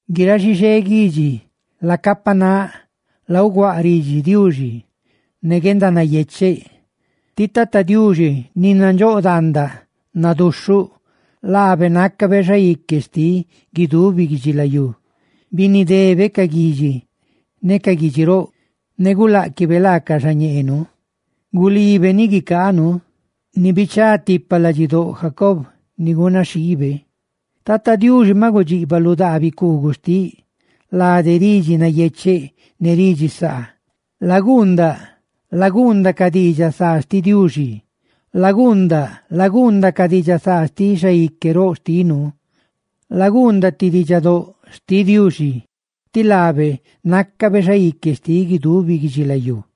¡Guiráꞌ xixé guidxi, lacapanáꞌ! ¡Lauguáꞌ ridxi Diuxi ne guendanayecheꞌ! Ti Tata Diuxi, ni nandxóꞌ daandaꞌ, naduxhuꞌ; laabe nácabe Xaique xtiꞌ guidubi guidxilayú. Binidebe ca guidxi ne ca guidxi roꞌ ne guláꞌquibe laacaꞌ xañeenu. Gulibe ni guicaanu, ni bichá tipa ladxidóꞌ Jacob, ni gunaxhiibe. ¡Tata Diuxi maꞌ gudxiꞌbaꞌ lu daa bicuugua xtiꞌ lade ridxi nayecheꞌ ne ridxi saa! ¡Laguundaꞌ, laguundaꞌ ca diidxaꞌ saa xtiꞌ Diuxi! ¡Laguundaꞌ, laguundaꞌ ca diidxaꞌ saa xtiꞌ Xaique roꞌ xtinu! ¡Laguundaꞌ ti diidxaguieꞌ xtiꞌ Diuxi, tí laabe nácabe Xaique xtiꞌ guidubi guidxilayú!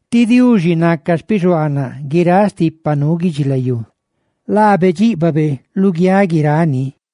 ti Diuxi naca xpixuaanaꞌ guiráꞌ stipa nuu guidxilayú. ¡Laabe dxíꞌbabe luguiáꞌ guirani!